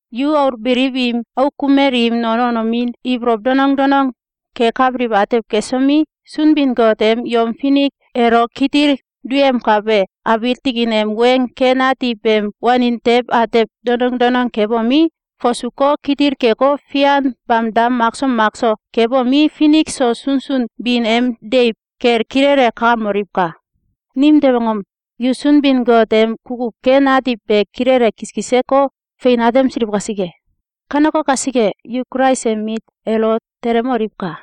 Yu aul beliw im auk kumel im non wanomin ibolow donong danong kekabiliw atew kesomi, Sunbin-Got em yom finik elo kitil duyemkabe abiil tikin em weng ken ati beem wanin tew atew donong donong kebomi, fasuko, kitil keko, fian bamda makso makso kebomi, finik so sunsun bin em deiw kel kilele kakamoliwka! Nimtew angom? Yu Sunbin-Got em kukuw ken ati be kilele kiskiseko, fein atemsiliw kasike. Kaneko kasike, yu Kulais em mit elo telemoliwka!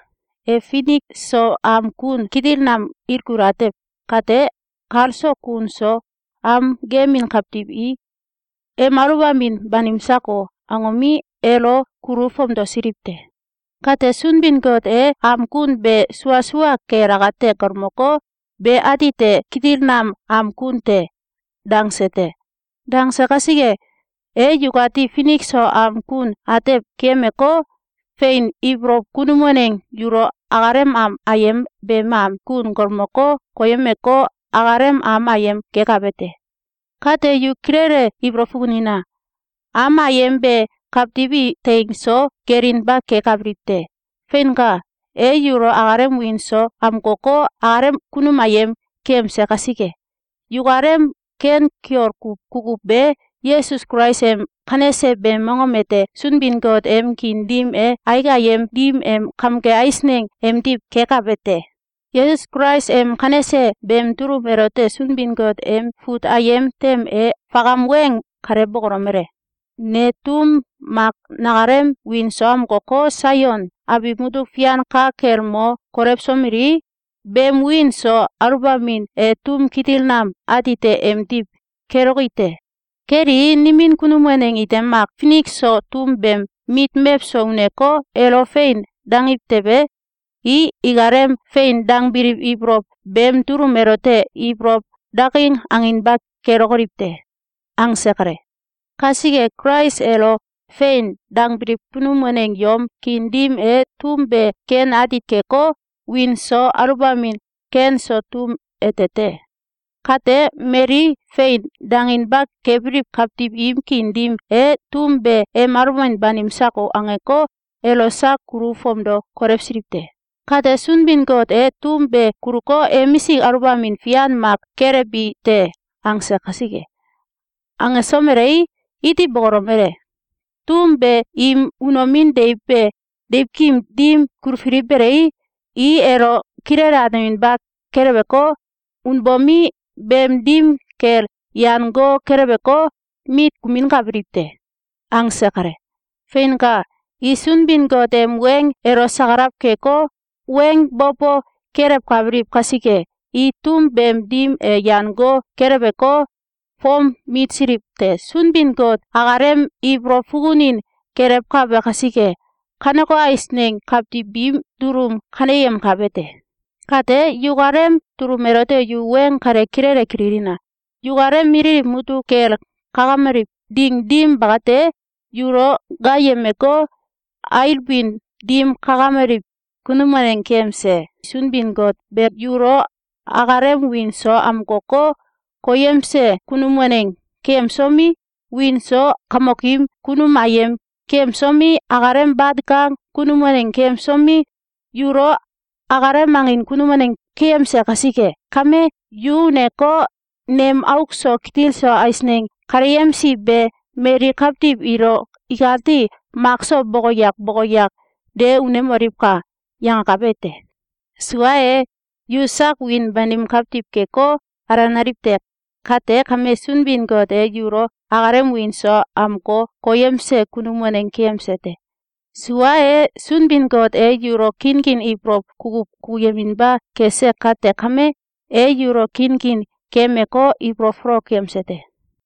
E finik so am kun kitil nam ilkul atew kate, kal so kun so am gemin kawtiw i “Em aluwbamin banim! Sako!”, angomi, elo kulu fomdosiliw te. Kate, Sunbin-Got e am kun be sua sua kel akate galmoko, “Be atite kitil nam am kun te!”, dangse te. Dangse kasike, e yukati finik so am kun atew keyemeko, fein ibolow kunum waneng yulo akalem am ayem beem am kun galmoko, koyemeko, akalem am ayem gekabe te. Kate, yu kilele ibolow fukunina! Am ayem be kawtiw i teing so gelinba kekabiliw te. Feinka! E yulo akalem wiin so amkoko, akalem kunum ayem keyemse kasike, yukalem ken kiol kuw kukuw be Yesus Kulais em kanese beem mongom ete Sunbin-Got em kiin dim e aik ayem dim em kamge eisneng emdiw kekabe te. Yesus Kulais em kanese beem dulum elote Sunbin-Got em fut ayem tem e fakam weng kale bokolomele: “Ne tum mak nakalem wiin so amkoko, Saion abiw mutuk fian ka kel mo kolewsomelii, beem wiin so aluwbamin e tum kitil nam, atite emdiw keloki te. Kelii, nimin kunum waneng ite mak finik so tum beem mit mewso uneko, elo “Fein!”, dangiw tewe, i ikalem “Fein!”, dangbiliw ibolow beem dulum elote ibolow daking anginba kelokoliw te.”, angse kale. Kasike, Kulais elo “Fein!”, dangbiliw kunum waneng yom kiin dim e tum be ken ati keko, wiin so aluwbamin ken so tum ete te. Kate, mali “Fein!”, danginba kebiliw kawtiw im kiin dim e, “Tum be ‘Em aluwbamin banim! Sako!’, angeko, elo sak kulu fomdo kolewsiliw te. Kate, Sunbin-Got e tum be kuluko, ‘Emisik aluwbamin fian mak kelewbi te!’, angse kasike.”, angesomelei, iti bokolomele: “Tum be im unomin deiw be deiwkim dim kulfili belei, i elo kilele ateminba keleweko, unbomi, beem dim kel yan go keleweko, mit kuminkabiliw te.”, angse kale. Feinka! I Sunbin-Got em weng elo sakalaw keko, weng bo bo kelewkabiliw kasike, i tum beem dim e yan go keleweko, fom mitsiliw te. Sunbin-Got akalem ibolow fukunin gelewkabe kasike, kaneko eisneng kawtiw biim dulum kaneyemkabe te. Kate, yukalem dulum elote yu weng kale kilele kililina! Yukalem mililiw mutuk kel kakameliw ding dim bakate, yulo gaayemeko, ailbin dim kakameliw kunum waneng keyemse Sunbin-Got be yulo akalem wiin so amkoko, koyemse kunum waneng keyemsomi, wiin so kamokim kunum ayem keyemsomi, akalem bat kang kunum waneng keyemsomi, yulo akalem angin kunum waneng keyemse kasike kame, “Yu uneko, nem auk so kitil so eisneng kaleyemsi be mali kawtiw ilo ikati makso boko yak boko yak de unemoliwka!”, yangakabe te. Sua e, yu sak wiin banim kawtiw keko, alenaliw te. Kate kame, Sunbin-Got e yulo akalem wiin so amko koyemse kunum waneng keyemse te. Sua e, Sunbin-Got e yulo kinkin ibolow kukuw kukuyeminba kese kate kame, e yulo kinkin keyemeko, ibolow folok keyemse te.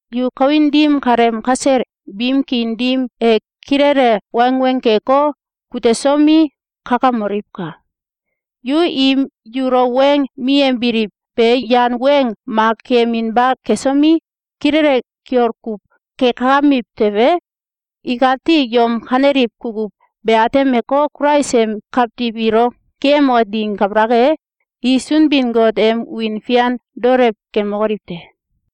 Yu kawin dim kaleem kasel biim kiin dim e kilele wangweng keko, kutesomi, kakamoliwka! Yu im yulo weng miyembiliw be yan weng mak keyeminba kesomi, kilele kiol kuw kekakamiw tewe, ikati yom kaneliw kukuw be atemeko, Kulais em kawtiw ilo geeyemoke ding kabalak e, i Sunbin-Got em wiin fian daolew kemokoliw te.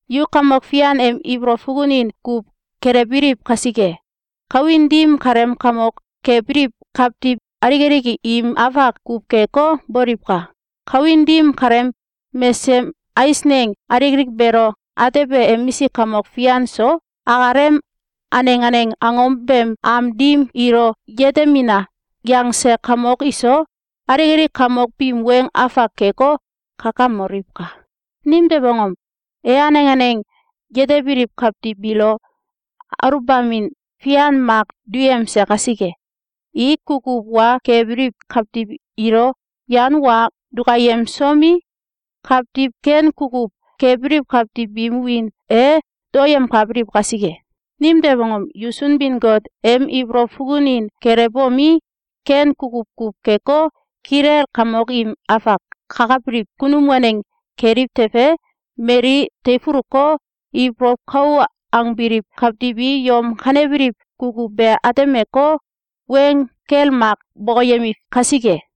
Yu Kamok Fian em ibolow fukunin kuw gelewbiliw kasike, kawin dim kaleem kamok kebiliw kawtiw alik alik im afak kuw keko, boliwka! Kawin dim kaleem mesesem eisneng alik alik beelo atebe emisik kamok fian so, akalem aneng aneng angom beem am dim “Ilo yetemina!”, yangse kamok iso, alik alik kamok biim weng afak keko, kakamoliwka! Nimtew angom? E aneng aneng yetebiliw kawtiw biilo aluwbamin fian mak duyemse kasike, i kukuw wa kebiliw kawtiw ilo yan wa dukayemsomi, kawtiw ken kukuw kebiliw kawtiw biim wiin e daoyemkabiliw kasike. Nimtew angom? Yu Sunbin-Got em ibolow fukunin gelewbomi, ken kukuw kuw keko, kilel kamok im afak kakabiliw kunum waneng keliw tewe, mali teifuluko, ibolow kou angebiliw kawtiw i yom kanebiliw kukuw be atemeko, weng gel mak nam bokoyemiw kasike.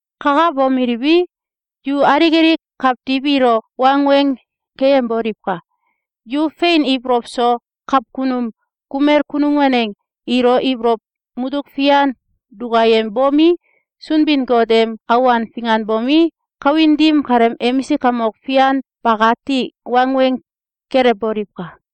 Kakabomeliwi, yu alik alik kawtiw ilo wangweng keyemboliwka! Yu fein ibolow so kawkunum kumel kunum waneng ilo ibolow mutuk fian dukayembomi, Sunbin-Got em awan finganbomi, kawin dim kaleem emisik kamok fian bakati wangweng kelewboliwka!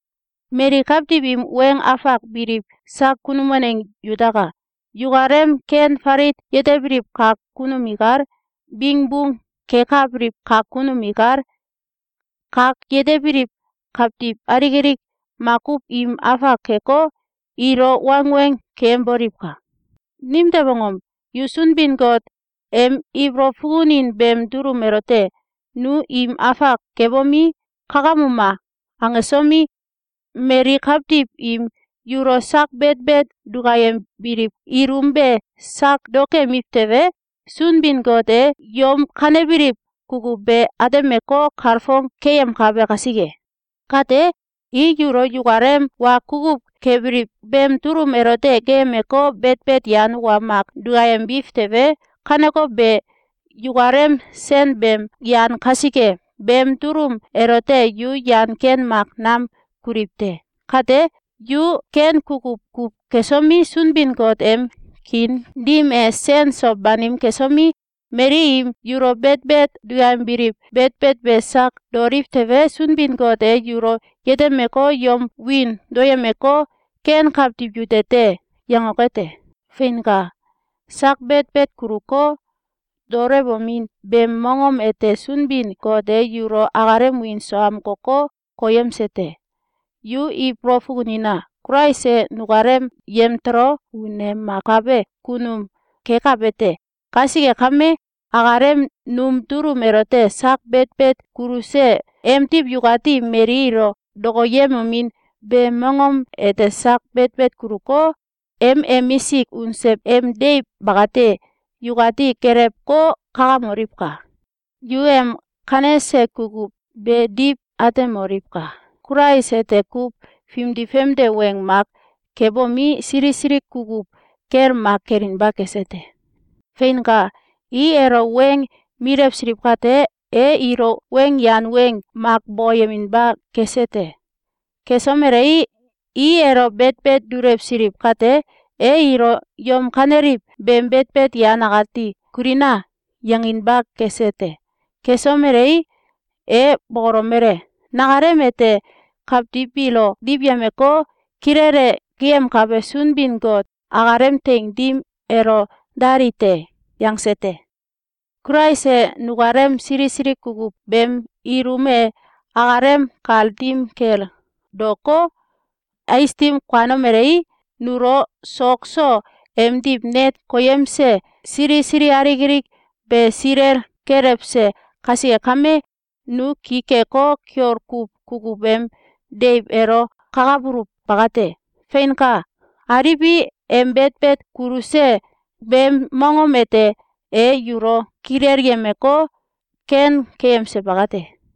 Mali kawtiw im weng afak biliw sak kunum waneng yutaka! Yukalem ken falit yetebiliw kak kunum ikal, bingbung kekabiliw kak kunum ikal, kak yetebiliw kawtiw alik alik makuw im afak keko, ilo wangweng keyemboliwka! Nimtew angom? Yu Sunbin-Got em ibolow fukunin beem dulum elote “Nu im afak kebomi, kakamuma!”, angsomi, mali kawtiw im yulo sak betbet dukayembiliw ilum be sak daokemiw tewe, Sunbin-Got e yom kanebiliw kukuw be atemeko, kalfong keyemkabe kasike. Kate, i yulo yukalem wa kukuw kebiliw beem dulum elote geeyemeko, betbet yan wa mak dukayembiw tewe, kaneko be yukalem sen beem yan kasike, beem dulum elote yu yan ken mak nam kuliw te. Kate, yu ken kukuw kuw kesomi, Sunbin-Got em kiin dim e sen so banim kesomi, mali im yulo betbet duyembiliw betbet be sak daoliw tewe, Sunbin-Got e yulo yetemeko, yom wiin daoyemko, “Ken kawtiw yute te!”, yangoke te. Feinka! Sak betbet kuluko, daolewomin beem mongom ete Sunbin-Got e yulo akalem wiin so amkoko, koyemse te. Yu ibolow fukunina! Kulais e nukalem yemtolo unemakabe kunum kekabe te. Kasike kame, akalem num dulum elote sak betbet kuluse emdiw yukati mali ilo dokoyemomin beem mongom ete sak betbet kuluko, em emisik unse em deiw bakate yukati gelewko, kakamoliwka! Yu em kanese kukuw be diw atemoliwka! Kulais ete kuw fimdi famde weng mak kebomi, sili sili kukuw gel mak kelinba kese te. Feinka! I elo weng milewsiliw kate, e ilo weng yan weng mak bokoyeminba kese te. Kesomelei, i elo betbet dulewsiliw kate, e ilo “Yom kaneliw beem betbet yan akati kulina!”, yanginba kese te. Kesomelei, e bokolomele: “Nakalem ete kawtiw biilo diwyemeko, kilele geeyemkabe Sunbin-Got akalem teing dim elo dali te!”, yangse te. Kulais e nukalem sili sili kukuw beem ilum e akalem kal dim kel daoko, ais dim kuanomelei, nulo sok so emdiw net koyemse sili sili alik alik be silel kelewse kasike kame, nu ki keko, kiol kuw kukuw em deiw elo kakabuluw bakate. Feinka! Aliwi, em betbet kuluse beem mongom ete e yulo kilelyemeko, ken keyemse bakate.